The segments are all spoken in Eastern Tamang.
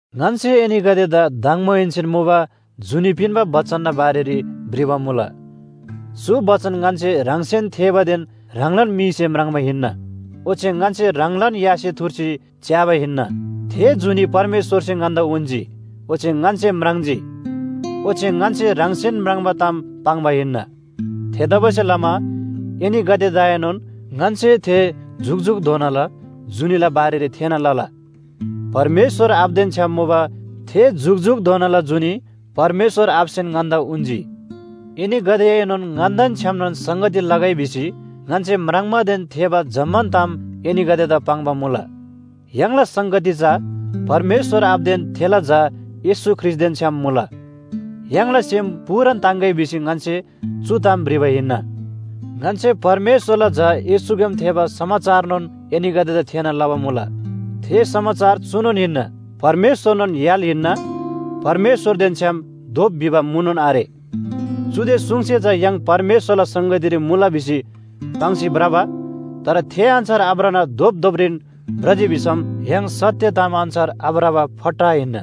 ङन्‍से एनीगदेदा दङबोहेन्‍सेन मुबा जुनी पिन्‍बा बचनना बारेरी भ्रिबा मुला। चु बचन ङन्‍से ह्राङसेन थेःबादेन ह्राङलान मीसे म्राङ्बा हिन्‍ना। ओच्‍छे ङन्‍से ह्राङलान यासे थुर्सी च्‍याबा हिन्‍ना। थे जुनी परमेश्‍वरसे ङन्‍दा उन्‍जी, ओच्‍छे ङन्‍से म्राङ्जी। ओच्‍छे ङन्‍से ह्राङसेन म्राङ्बा ताम पाङ्बा हिन्‍ना। थेतबासेलमा एनीगदेदाएनोन ङन्‍से थे जुकजुकधोनाला जुनीला बारेरी थेःना लला। परमेश्‍वर आबादेन छ्‌याम मुबा थे जुकजुकधोनाला जुनी परमेश्‍वर आबासेन ङन्‍दा उन्‍जी। एनीगदेएनोन ङन्‍देन छ्‌यामनोन संगती लगै भिसी ङन्‍से म्राङ्बादेन थेःबा जम्‍मान ताम एनीगदेदा पाङ्बा मुला। य्‍हाङला संगती चा परमेश्‍वर आबादेन थेला झा येशू ख्रीष्‍टदेन छ्‌याम मुला य्‍हाङला सेम पूरान ताङ्‌गै भिसी ङन्‍से चु ताम भ्रिबा हिन्‍ना। ङन्‍से परमेश्‍वरला झा येशूग्‍याम थेःबा समाचारनोन एनीगदेदा थेःना लबा मुला। थे समाचार चुनोन हिन्‍ना, परमेश्‍वरनोन य्‍हाल हिन्‍ना, परमेश्‍वरदेन छ्‌याम धोप भिबा मुनोन आरे। चुदे सुङसे चा य्‍हाङ परमेश्‍वरला संगतीरी मुला भिसी पाङ्सी भ्रबा, तर थे अन्‍छार आभ्रना धोपधोपरीन भ्रजी भिसम य्‍हाङ सत्‍य ताम अन्‍छार आभ्रबा फट्टा हिन्‍ना।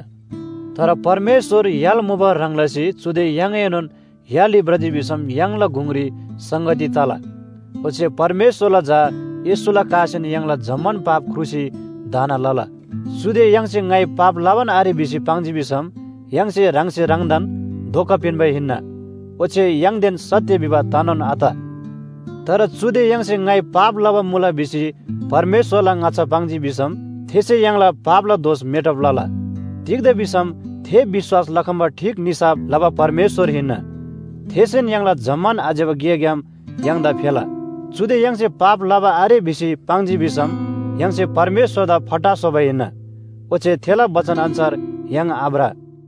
तर परमेश्‍वर य्‍हाल मुबा ह्रङ् लसी चुदे य्‍हाङएनोन य्‍हालरी भ्रजी भिसम य्‍हाङला गुङरी संगती तला। ओच्‍छे परमेश्‍वरला झा येशूला कासेन य्‍हाङला जम्‍मान पाप ख्रुसी धाना लला। चुदे य्‍हाङसे ङाइ पाप लबान आरे भिसी पाङ्जी भिसम य्‍हाङसे ह्राङसे ह्राङदान धोका पिन्‍बा हिन्‍ना। ओच्‍छे य्‍हाङदेन सत्‍य भिबा तनोन आत। तर चुदे य्‍हाङसे ङाइ पाप लबा मुला भिसी परमेश्‍वरला ङाच्‍छा पाङ्जी भिसम थेसे य्‍हाङला पापला दोष मेटब लला। तिग्‍दा भिसम थे विश्‍वास लखम्‍बा ठीक निसाफ लबा परमेश्‍वर हिन्‍ना। थेसेन य्‍हाङला जम्‍मान आज्‍यबा गेग्‍याम य्‍हाङदा फेला। चुदे य्‍हाङसे पाप लबा आरे भिसी पाङ्जी भिसम य्‍हाङसे परमेश्‍वरदा फट्टा स्‍होबा हिन्‍ना, ओच्‍छे थेला बचन अन्‍छार य्‍हाङ आभ्र।